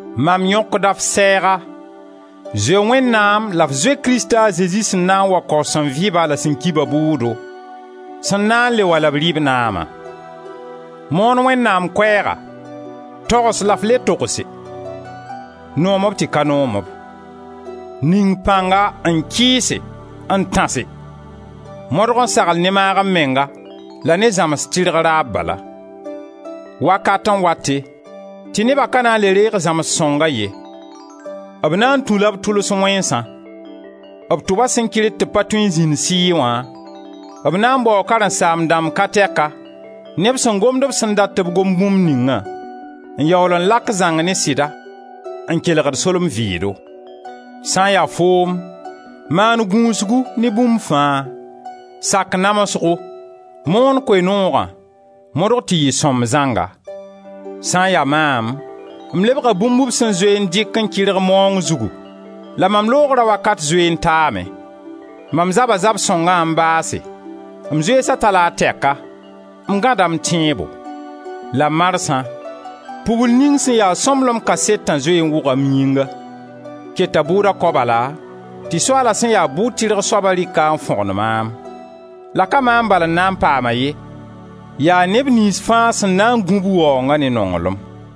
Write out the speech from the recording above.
Mam yõkda f sɛɛga, zoe Wẽnnaam la f zoe Krista a Zezi sẽn na n wa kao sẽn vɩ-ba la sẽn ki-ba bʋʋdo, sẽn na n le wa la b dɩ b naama: moon Wẽnnaam Koɛɛga, togs la f le togse, noom-b tɩ ka noom-b; ning pãnga n kɩɩse, n tãse; modg n sagl ne maag-m-menga la ne zãmsg tɩrg raab bala. Wakat n wate tɩ neba ka na n le reeg zãmsg sõnga ye; b na n tũla b tʋls wẽnsã; b tʋba sẽn kɩrd tɩ b pa tõe n zĩnd sɩɩ wã, b na n baoo karen-saam-dãmb ka tɛka, neb sẽn gomd b sẽn dat tɩ b gom bũmb ningã, n yaool n lak zãng ne sɩda, n kelgd solem-vɩɩdo. Sã n ya foom, maan gũusgu ne bũmb fãa, sak namsgo, moon Koe-noogã, modg tɩ yɩ sõmb zãnga. Sã n ya maam, m lebga bũmb b sẽn zoe n dɩk n kɩrg maoong zugu la mam loogra wakat zoe n taame. Mam zaba zab-sõngã n baase, m zoeesa ta-la a tɛka, m gãda m tẽebo. La marsã, pugl ning sẽn ya sõmblem kasetã zoe n wʋga m yĩnga. Keta bʋʋda kao bala tɩ Soaala sẽn ya bʋ-tɩrg soaba rɩk-a n fõgen maam; la ka maam bal n na n paam-a ye, yaa neb niyns fãa sẽn na n gũ b waoonga ne nonglem.